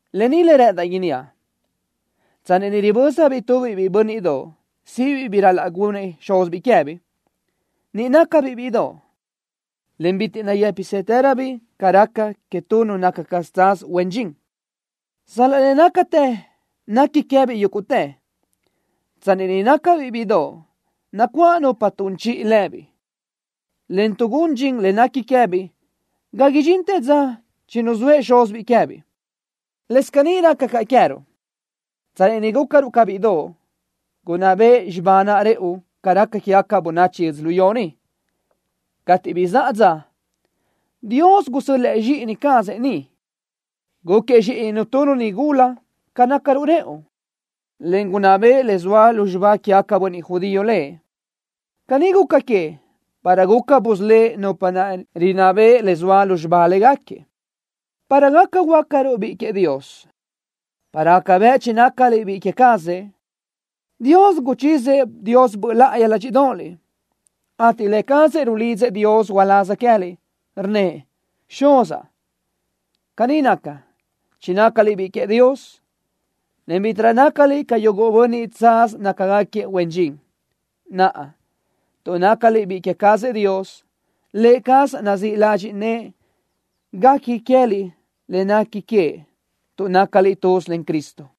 Lë ni le rë́ʼëndaʼ inníaʼ: Tsanni ni ribö́zabiʼ tu biʼiʼ bö́nniʼdoʼ síʼibiʼ bi ral-laʼ gunnëʼ xúzibiʼ queë́biʼ, niʼ nácabiʼ bíʼidoʼ, en bitiʼ nayë́pisëtëröbiʼ ca raca que tu nu naca tsaz huen dxin, sal-laʼ le nácatë nequi queë́biʼ yúguʼtë. Tsanni niʼ nácabiʼ bíʼidoʼ, nacuáʼ nupa tun chiʼi lëbiʼ, en tuʼgún dxin le nequi queë́biʼ ga idxintë dza chinuzóëʼ xúzibiʼ queë́biʼ. Lës caní raca caʼ queë́ruʼ. Tsanni niʼ gúcaruʼ ca bíʼidoʼ, gunná beʼe xibá naʼ rëʼu ca raca quégaca bönachi yödzölió ni. Cateʼ bizáʼa dza, Dios gusö́l-lëʼë zxíʼini cazëʼ ni. Gúquiëʼ zxíʼininu tu nigula ca nácaruʼ rëʼu, en gunná beʼe le zoa lu xibá quégaca bönniʼ judío Lëʼ. Caní guca queëʼ para guca busölë́ʼ nupa naʼ rinná beʼe le zoa lu xibá léguequi, para gaca huöácaruʼ biʼi queëʼ Dios. Para gaca bëʼ chinácaliʼ biʼi queë cazëʼ, Dios guchizëʼ Dios Böʼ láʼayi ládxiʼdoʼoliʼ, ateʼ Lë cazëʼ rulidzëʼ Dios uláz queë́liʼ, rnnëʼ: “Xuzaʼ.” Caní naca, chinácaliʼ biʼi queëʼ Dios, en bítiʼrö nácaliʼ ca yuguʼ bönniʼ tsaz nácagaquiëʼ huen dxin. Naʼa, tuʼ nácaliʼ biʼi queë cazëʼ Dios, Lë cazëʼ nazíʼ ladxiʼ nëʼë guequi queë́liʼ le nequi queëʼ tuʼ nácaliʼ tuz len Cristo.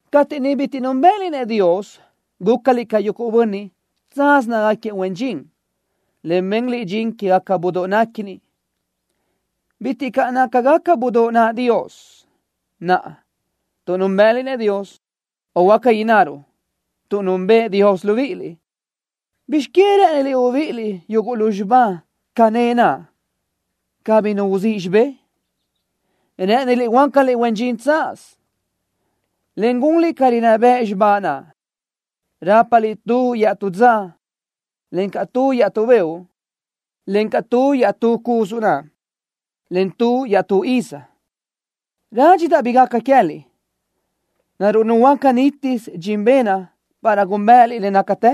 Cateʼ niʼ bitiʼ núnbëʼëliʼ-nëʼ Dios, gúcaliʼ ca yuguʼ bönniʼ, tsaz nácagaquiëʼ huen dxin, en benliʼ dxin quégaca budóʼ néquini. Bitiʼ caʼ nácagaca budóʼ naʼ Dios. Naʼa, tuʼ núnbëʼëliʼ-nëʼ Dios, o huáca innaruʼ: Tuʼ núnbëʼë Dios libíʼiliʼ, ¿bizx queë rë́ʼëniliʼ ubíʼiliʼ yuguʼ lu xibá cané naʼ cabí nu uzíʼ xibé? ¿Rë́ʼëniliʼ huöácaliʼ huen dxin tsaz, en gunliʼ ca rinná bëʼ xibá naʼ? Rápaliʼ tu iaʼtú dza, encaʼ tu iaʼtú beoʼ, encaʼ tu iaʼtú cusu na, en tu iaʼtú iz. Rádxidaʼ bi gaca queë́liʼ. ¿Naruʼ nuhuöáca nítisö dxin benaʼ para gúnbëʼëliʼ le nácatë?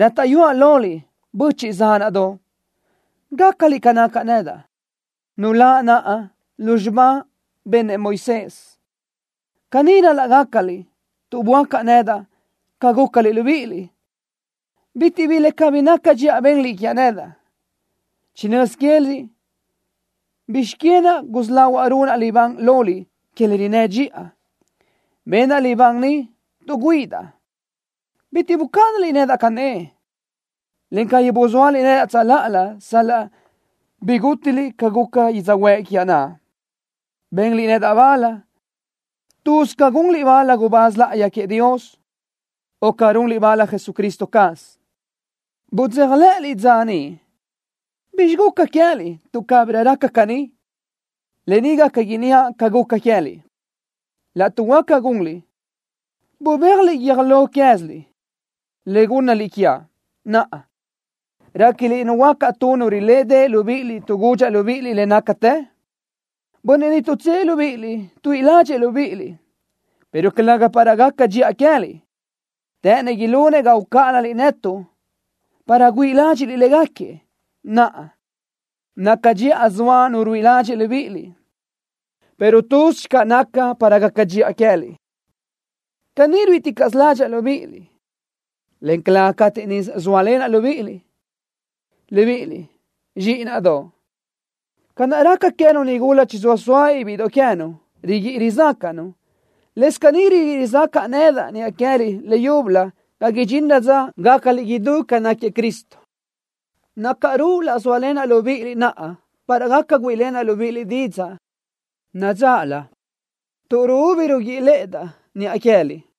Rátaʼyuáʼ loliʼ, böchiʼ zánaʼdoʼ, gácaliʼ ca nacaʼ nedaʼ, nuláʼ naʼa lu naʼ xibá benëʼ Moisés. Caní ral-laʼ gácaliʼ tuʼ böácaʼ nedaʼ ca gúcaliʼ libíʼiliʼ. Bitiʼ bi le cabí naca dxiʼa benliʼ quiaʼ nedaʼ. Chinö́z quéziliʼ bizx queë naʼ gusí lahuaʼ runaʼ libán loliʼ que le rinnë́ dxiʼa. Benaʼ libán niʼ tuʼ güíʼidaʼ. Bitiʼ bucáʼanaliʼ nedaʼ cané, en cabí buzóaliʼ nedaʼ tsöláʼalö sal-laʼ bigútiliʼ ca guca yödzöhuë́ʼ quiaʼ naʼ. Benliʼ nedaʼ bal, tuz ca gunliʼ bal tu gubáz láʼayi queëʼ Dios, o ca runliʼ bal Jesucristo caz. Budzéjalëʼëliʼ dza niʼ. ¿Bizxi guca queë́liʼ tuʼ cabirö raca caní? Lë ni gaca inníaʼ ca guca queë́liʼ: Laʼtuʼ huáca gunliʼ, bubéajliʼ guiö́j lo quéziliʼ, le gúnnaliʼ quiaʼ. Naʼa, ¿réquiliʼ nuhuöácaʼ tu nu rilédeʼe libíʼiliʼ tuʼ gudxaʼ libíʼiliʼ le nácatë? Bönniʼ niʼ tuʼtsë́ʼë libíʼiliʼ tuíʼi ládxëʼë libíʼiliʼ, pero calëga para gaca dxiʼa queë́liʼ. Të́ʼënëʼ ilunëʼ ga ucáʼanaliʼ netuʼ para güíʼi ládxiʼliʼ légaquiëʼ. Naʼa, naca dxiʼa zoa nu ruíʼi ladxiʼ libíʼiliʼ, pero tuz channö naca para gaca dxiʼa queë́liʼ. Caní ruíʼiticaʼsö ládxaʼa libíʼiliʼ, en calë́gasö cateʼ niʼ zóalenaʼ libíʼiliʼ. Libíʼiliʼ, zxíʼinaʼdoʼ. Ca naʼ raca queë́nu nigula chizóa sóabiʼ bíʼidoʼ queë́nu, riguíʼi rizácaʼnu, lës caní riguíʼi rizácaʼa nedaʼ niʼa queë́liʼ leyúbölö ga idxinrö dza gácaliʼ idú ca náquiëʼ Cristo. Nácaru laʼ zóalenaʼ libíʼiliʼ naʼa para gaca güíʼilenaʼ libíʼiliʼ didzaʼ nadzáʼalö, tuʼ ruúbi ruguíʼilëʼëdaʼ niʼa queë́liʼ.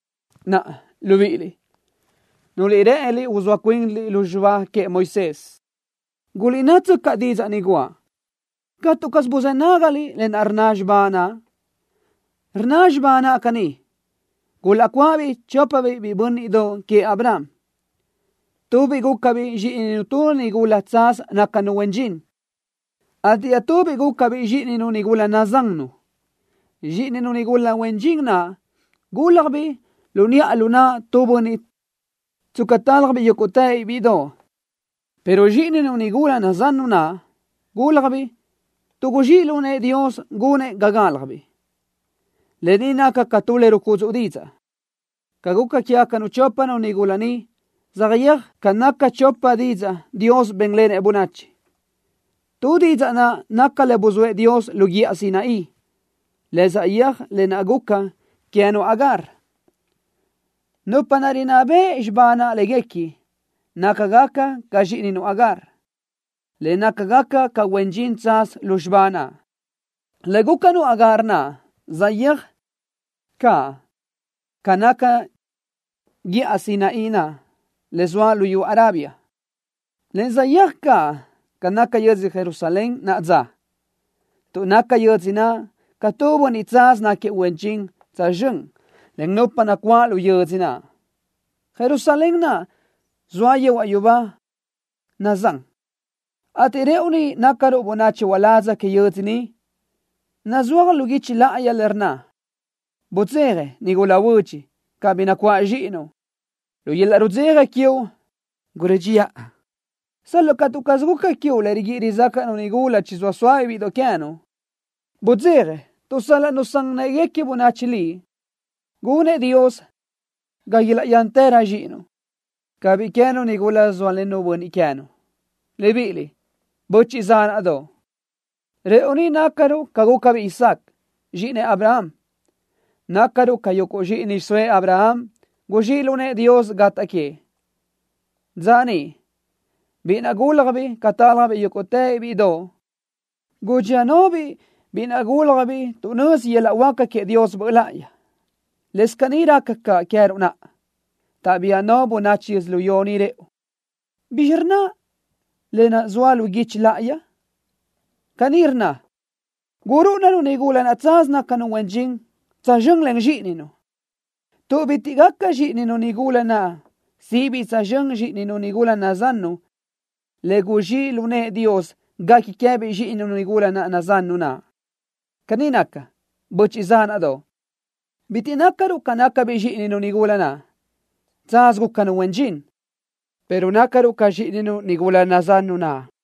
Naʼa, libíʼiliʼ, nuliʼ rë́ʼëniliʼ uzóa cuinliʼ lu xibá queëʼ Moisés, guliʼnáʼtsöcaʼ didzaʼ ni guʼa. ¿Catu caz buzë́ nágaliʼ le rnna xibá naʼ? Rnna xibá naʼ caní: gulaʼcuáʼabiʼ chópabiʼ biʼi bö́nniʼdoʼ queëʼ Abraham. Tubiʼ gúcabiʼ zxíʼininu tu nigula tsaz nácanu huen dxin, ateʼ iaʼtubiʼ gúcabiʼ zxíʼininu nigula nazannu. Zxíʼininu nigula huen dxin naʼ gúlajbiʼ lu niʼa lu naʼ tu bönniʼ tsca tálajbiʼ yúguʼtë bíʼidoʼ, pero zxíʼininu nigula nazannu naʼ gúlajbiʼ tuʼ guzxíʼ lu nëʼë Dios gunëʼ ga gálajbiʼ. Lë ni naca ca tu le rucudzuʼ didzaʼ. Ca guca quégacanu chópanu nigula ni saʼyéaj ca naca chopa didzaʼ Dios bénlenëʼ bönachi. Tu didzaʼ naʼ naca le buzóëʼ Dios lu guíʼa Sinaí, le saʼyéaj lë naʼ guca queë́nu Agar. Nupa naʼ rinná beʼe xibá naʼ léguequi, nácagaca ca zxíʼininu Agar, en nácagaca ca huen dxin tsaz lu xibá naʼ. Le gúcanu Agar naʼ saʼyéaj caʼ ca naca guíʼa Sinaí naʼ le zoa luyú Arabia, en saʼyéaj caʼ ca naca yödzö Jerusalén naʼa dza, tuʼ naca yödzö naʼ ca tu bönniʼ tsaz náquiëʼ huen dxin tsözxö́n len nupa nacuáʼ lu yödzö naʼ. Jerusalén naʼ zoa yehuaʼ yubá nazán, ateʼ rëʼu ni nácaruʼ bönachi uládz que yödzö niʼ. Nazúaj lu guichi láʼayi le rnna: Budzeja, nigula huödx, cabí nacuáʼ zxíʼinuʼ. Lu yöl-laʼ rudzeja quiuʼ gurö́dxiʼa, sal-laʼ catu caz guca quiuʼ le riguíʼi rizácaʼnu nigula chizóa sóabiʼ bíʼidoʼ queë́nu. Budzeja tuʼ sal-laʼ nusán në́ʼeguequi bönachi liʼ, gunëʼ Dios ga ilaʼyántërö zxíʼinuʼ ca biʼi queë́nu nigula zóalennu bönniʼ queë́nu. Libíʼiliʼ, böchiʼ zánaʼdoʼ, rëʼu ni nácaruʼ ca gúcabiʼ Isaac, zxíʼinëʼ Abraham. Nácaruʼ ca yuguʼ zxíʼini xiʼsóëʼ Abraham, guzxíʼ lu nëʼë Dios gataʼ queëʼ. Dza niʼ, biʼi naʼ gúlajbiʼ ca tálajbiʼ yúguʼtë bíʼidoʼ, gudxía náʼabiʼ biʼi naʼ gúlajbiʼ tuʼ nözi yöl-laʼ huáca queëʼ Dios Böʼ láʼayi. Lës caní raca caʼ queë́ruʼ naʼa, taʼbía no bönachi yödzölió ni rëʼu. ¿Bizxí rnna le zoa lu guichi láʼayi? Caní rnna: “Gurúʼuna-nu nigula naʼ tsaz nácanu huen dxin tsözxö́n len zxíʼininu, tuʼ bitiʼ gaca zxíʼininu nigula naʼ síʼibiʼ tsözxö́n zxíʼininu nigula nazannu le guzxíʼ lu nëʼë Dios guequi queë́biʼ zxíʼininu nigula nazannu naʼ.” Caní naca, böchiʼ zánaʼdoʼ. Bitiʼ nácaruʼ ca nácabiʼ zxíʼininu nigula naʼ, tsaz gúcanu huen dxin, pero nácaruʼ ca zxíʼininu nigula nazannu naʼ.